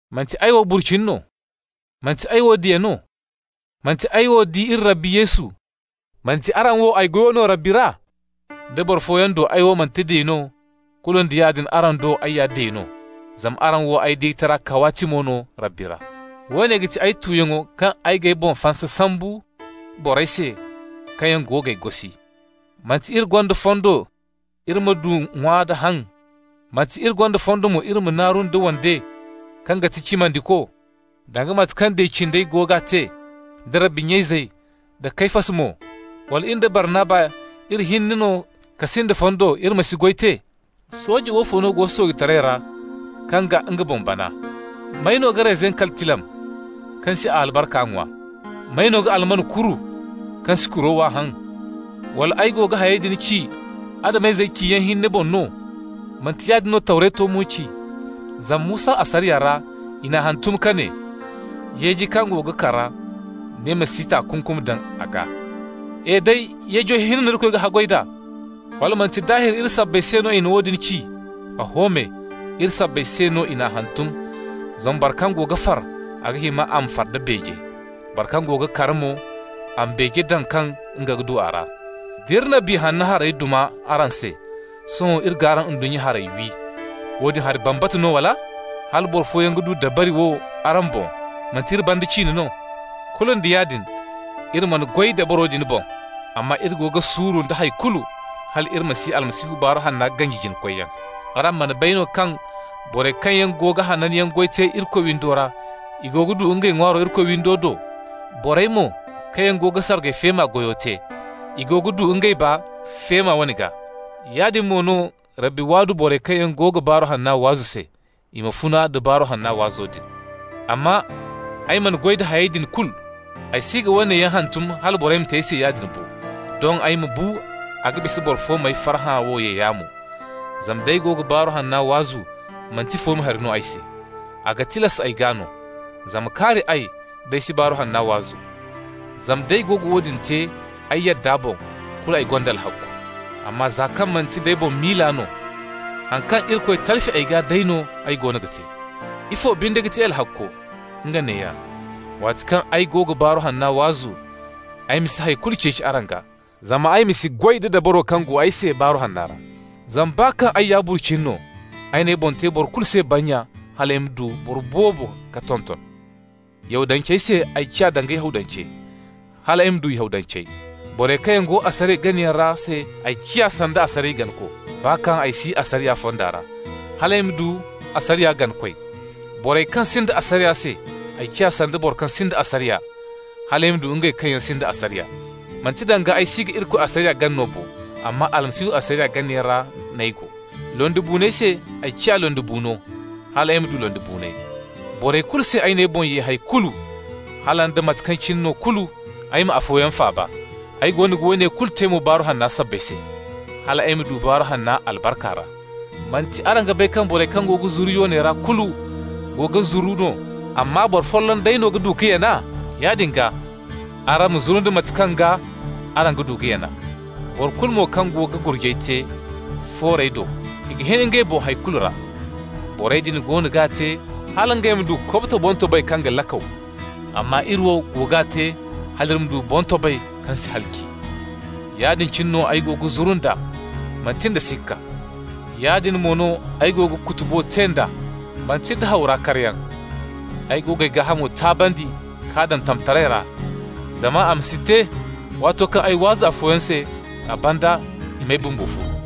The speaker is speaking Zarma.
Manti ay wo burcini no? Manti ay wo diya no? Manti ay wo di iri Rabbi Yesu? Manti araŋ wo ay goyo no Rabbi ra? Da boro fooyaŋ do ay wo manti diya no, kulu nda yaadin araŋ do ay ya diya no, zama araŋ wo ay diyataray kawaatimi no Rabbi ra. Woone ga ti ay tuyaŋo kaŋ ay g'ay boŋ fansa sambu, borey se kaŋ yaŋ go g'ay gosi. Manti iri gonda fondo iri ma du ŋwa-da-haŋ? Manti iri gonda fondo mo iri ma naaru nda wande kaŋ ga ti cimandiko, danga mate kaŋ diya cindey go ga te, da Rabbi nya izey, da Kefas mo? Wala in da Barnaba, iri hinne no ka sinda fondo iri ma si goy te? Sooje woofo no go soojetaray ra kaŋ ga nga boŋ bana? May no ga reyzin kali tilam kaŋ si a albarka ŋwa? May no ga alman kuru kaŋ si kuro wa haŋ? Wala ay go ga hayey din ci Adam-izey ciyaŋ hinne boŋ no? Manti yaadin no Tawreto mo ci? Zama Musa asariya ra i n'a hantum ka ne: «Yeeji kaŋ go ga kara, ni ma si takunkum daŋ a gaa.» E day! Yeejey hinne no Irikoy ga haggoy d'a? Wala manti daahir iri sabbay se no a na woodin ci? Oho me, iri sabbay se no i n'a hantum. Zama boro kaŋ go ga far, a ga hima a ma far da beeje. Boro kaŋ go ga kara mo, a ma beeje daŋ kaŋ nga ga du a ra. D'iri na Biya Hanno harey duma araŋ se, sohõ d'iri g'araŋ ndunnya harey wi, woodin hari bambata no, wala? Hala boro fooyaŋ ga du dabari wo araŋ boŋ, manti iri banda ciine no? Kulu nda yaadin, iri mana goy dabaro din boŋ, amma iri go ga suuru nda hay kulu, hal iri ma si Almasihu Baaru Hanna ganji jina-koyyaŋ. Araŋ mana bay no kaŋ borey kaŋ yaŋ go ga hananyaŋ goy te Irikoy windo ra, i go ga du ngey ŋwaaro Irikoy windo do? Borey mo kaŋ yaŋ go ga sargay feema goyo te, i go ga du ngey baa feema wane gaa. Yaadin mo no, Rabbi waadu borey kaŋ yaŋ go ga Baaru Hanna waazu se, i ma funa nda Baaru Hanna waazo din. Amma ay mana goy da hayey din kulu. Ay si ga woone yaŋ hantum hala borey ma te ay se yaadin bo. Doŋ ay ma bu, a ga bisa boro fo m'ay farhã wo ye yaamo. Zama d'ay go ga Baaru Hanna waazu, manti fooma hari no ay se. A ga tilas ay gaa no. Zama kaari ay, d'ay si Baaru Hanna waazu! Zama d'ay go ga woodin te ay yadda boŋ, kulu ay gonda alhakku. Amma za kaŋ manti nd'ay boŋ miila no, haŋ kaŋ Irikoy talfi ay gaa day no ay goono ga te. Ifo binde ga ti ay alhakko? Nga neeya: waati kaŋ ay go ga Baaru Hanna waazu, ay ma si hay kulu ceeci araŋ gaa, zama ay ma si goy da dabaro kaŋ go ay se Baaru Hanna ra. Zama baa kaŋ ay ya burcini no, ay n'ay boŋ te boro kulu se bannya hal ay ma du boro boobo ka tonton. Yahudancey se ay ciya danga Yahudance, hal ay ma du Yahudancey. Borey kaŋ yaŋ go asariya ganayaŋ ra se, ay ciya sanda asariya ganako, (baa kaŋ ay si asariya fonda ra), hal ay ma du asariya ganakoy. Borey kaŋ sinda asariya se, ay ciya sanda boro kaŋ sinda asariya, hal ay ma du ngey kaŋ yaŋ sinda asariya. (Manti danga ay si ga Irikoy asariya gana no bo, amma Almasihu asariya ganayaŋ ra n'ay go). Londibuuney se ay ciya londibuuno hal ay ma du londibuuney. Borey kulu se, ay n'ay boŋ ye hay kulu, hala nda mate kaŋ cine no kulu ay ma afooyaŋ faaba. Ay go ga woone kulu te mo Baaru Hanna sabbay se, hal ay ma du baa Baaru Hanna albarka ra. Manti araŋ ga bay kaŋ borey kaŋ go ga zuru yoonay ra kulu go ga zuru no, amma boro folloŋ day no ga du ka yana? Yaadin gaa, araŋ ma zuru nda mate kaŋ gaa araŋ ga du ka yana. Boro kulu mo kaŋ go ga gurjay te foorey do, i ga hin ngey boŋ hay kulu ra. Borey din goono g'a te hal ngey ma du kobto boŋtobay kaŋ ga lakaw, amma iri wo go g'a te hal iri ma du boŋtobay kaŋ si halaci. Yaadin cine no ay go ga zuru nd'a, manti nda sikka. Yaadin mo no ay go ga kutubo te d'a, manti nda haw ra karyaŋ. Ay go g'ay gaahamo taabandi k'a daŋ tamtaray ra, zama a ma si te, waato kaŋ ay waazu afooyaŋ se, a banda i m'ay bumbo furu.